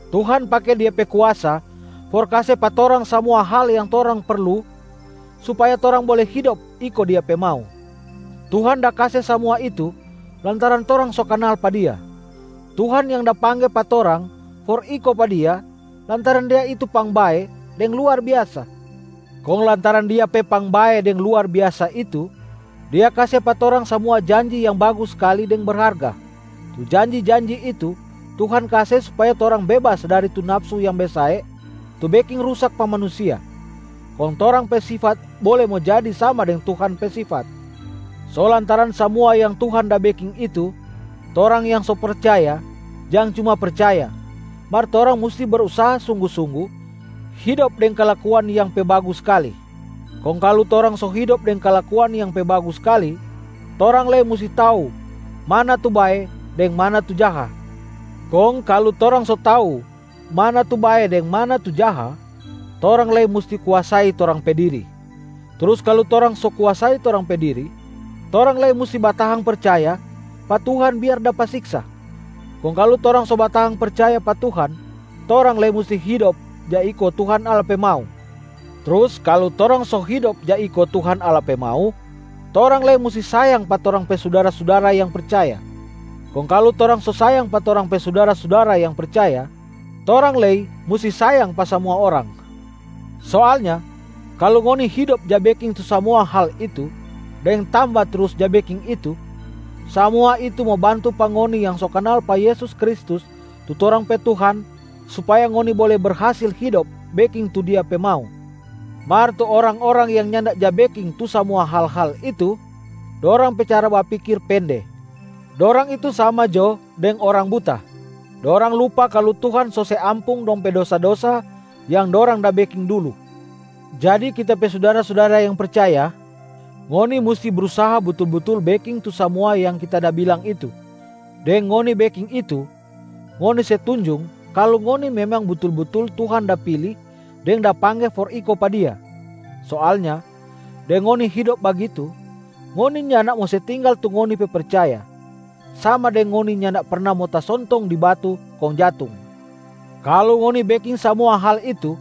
Tuhan pake Dia pe kuasa for kase pa torang samua hal yang torang perlu supaya torang bole hidop iko Dia pe mau. Tuhan da kase samua itu lantaran torang so kanal pa Dia. Tuhan yang da pangge pa torang for iko pa Dia lantaran Dia itu pangbae deng luar biasa. Kong lantaran Dia pe pangbae deng luar biasa itu, Dia kase pa torang samua janji yang bagus skali deng berharga. Tu janji-janji itu Tuhan kase supaya torang bebas dari tu nafsu yang besae tu beking rusak pa manusia, kong torang pe sifat bole mo jadi sama deng Tuhan pe sifat. So lantaran samua yang Tuhan da beking itu, torang yang so percaya jang cuma percaya, mar torang musti brusaha sunggu-sunggu hidop deng kalakuan yang pe bagus skali. Kong kalu torang so hidop deng kalakuan yang pe bagus skali, torang lei musti tau mana tu bae deng mana tu jaha. Kong kalu torang so tau mana tu bae deng mana tu jaha, torang lei musti kuasai torang pe diri. Trus kalu torang so kuasai torang pe diri, torang lei musti batahang percaya pa Tuhan biar dapa siksa. Kong kalu torang so batahang percaya pa Tuhan, torang lei musti hidop ja iko Tuhan Allah pe mau. Trus kalu torang so hidop ja iko Tuhan Allah pe mau, torang lei musti sayang pa torang pe sudara-sudara yang percaya. Kong kalu torang so sayang pa torang pe sudara-sudara yang percaya, torang lei musti sayang pa samua orang. Soalnya kalu ngoni hidop ja beking tu samua hal itu deng tamba trus ja beking itu, samua itu mo bantu pa ngoni yang so kanal pa Yesus Kristus tu torang pe Tuhan supaya ngoni bole berhasil hidop beking tu Dia pe mau. Mar tu orang-orang yang nyanda ja beking tu samua hal-hal itu, dorang pe cara bapikir pende, dorang itu sama jo deng orang buta. Dorang lupa kalu Tuhan so se ampung dong pe dosa-dosa yang dorang da beking dulu. Jadi kita pe sudara-sudara yang percaya, ngoni musti brusaha butul-butul beking tu samua yang kita da bilang itu. Deng ngoni beking itu, ngoni se tunjung kalu ngoni memang butul-butul Tuhan da pili deng da pangge for iko pa Dia. Soalnya deng ngoni hidop bagitu, ngoni nyanda mo se tinggal tu ngoni pe percaya, sama deng ngoni nyanda perna mo tasontong di batu kong jatung. Kalu ngoni beking samua hal itu,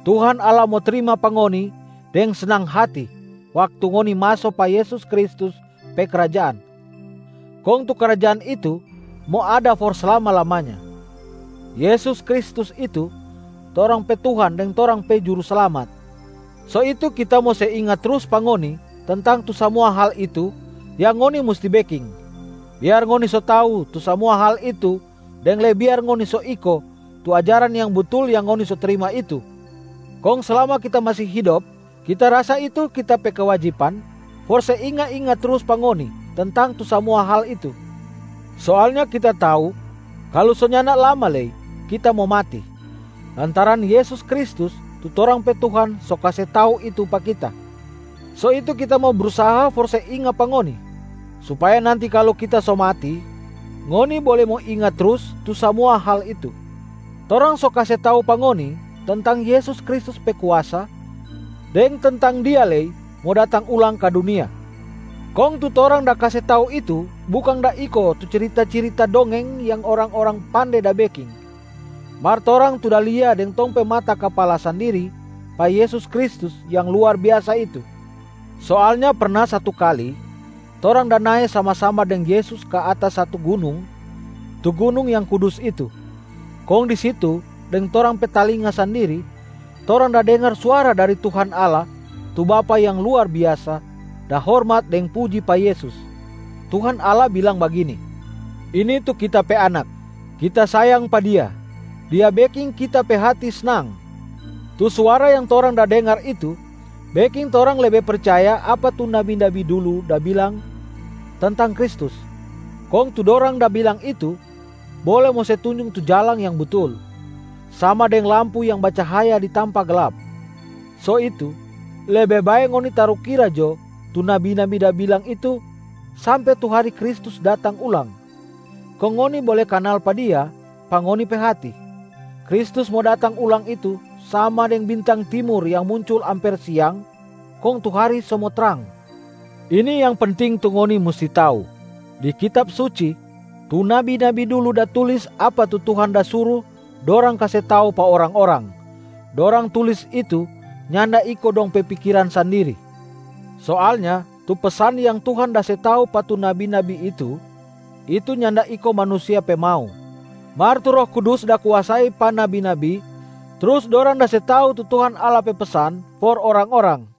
Tuhan Allah mo trima pa ngoni deng snang hati waktu ngoni maso pa Yesus Kristus pe krajaan, kong tu krajaan itu mo ada for slama-lamanya. Yesus Kristus itu torang pe Tuhan deng torang pe Juruslamat. So itu kita mo se inga trus pa ngoni tentang tu samua hal itu yang ngoni musti beking, biar ngoni so tau tu samua hal itu deng lei biar ngoni so iko tu ajaran yang butul yang ngoni so trima itu. Kong slama kita masi hidop, kita rasa itu kita pe kewajiban for se inga-inga trus pa ngoni tentang tu samua hal itu. Soalnya kita tau kalu so nyanda lama lei kita mo mati, lantaran Yesus Kristus tu torang pe Tuhan so kase tau itu pa kita. So itu kita mo brusaha for se inga pa ngoni, supaya nanti kalu kita so mati, ngoni bole mo inga trus tu samua hal itu. Torang so kase tau pa ngoni tentang Yesus Kristus pe kuasa deng tentang Dia lei mo datang ulang ka dunia. Kong tu torang da kase tau itu bukang da iko tu cirita-cirita dongeng yang orang-orang pande da beking, mar torang tu da lia deng tong pe mata kapala sandiri pa Yesus Kristus yang luar biasa itu. Soalnya perna satu kali, torang da nae sama-sama deng Yesus ka atas satu gunung, tu gunung yang kudus itu. Kong di situ deng torang pe talinga sandiri, torang da dengar suara dari Tuhan Allah tu Bapa yang luar biasa da hormat deng puji pa Yesus. Tuhan Allah bilang bagini, “Ini tu Kita pe Anak, Kita sayang pa Dia. Dia beking Kita pe hati snang.” Tu suara yang torang da dengar itu beking torang lebe percaya apa tu nabi-nabi dulu da bilang tentang Kristus. Kong tu dorang da bilang itu bole mo se tunjung tu jalang yang butul, sama deng lampu yang bacahaya di tampa glap. So itu, lebe bae ngoni tarukira jo tu nabi-nabi da bilang itu sampe tu hari Kristus datang ulang, kong ngoni bole kanal pa Dia pa ngoni pe hati. Kristus mo datang ulang itu sama deng bintang timur yang muncul amper siang kong tu hari so mo trang. Ini yang penting tu ngoni musti tau: Di Kitab Suci, tu nabi-nabi dulu da tulis apa tu Tuhan da suru dorang kase tau pa orang-orang, dorang tulis itu nyanda iko dong pe pikiran sandiri. Soalnya tu pesan yang Tuhan da se tau pa tu nabi-nabi itu, itu nyanda iko manusia pe mau, mar tu Roh Kudus da kuasai pa nabi-nabi trus dorang da se tau tu Tuhan Allah pe pesan for orang-orang.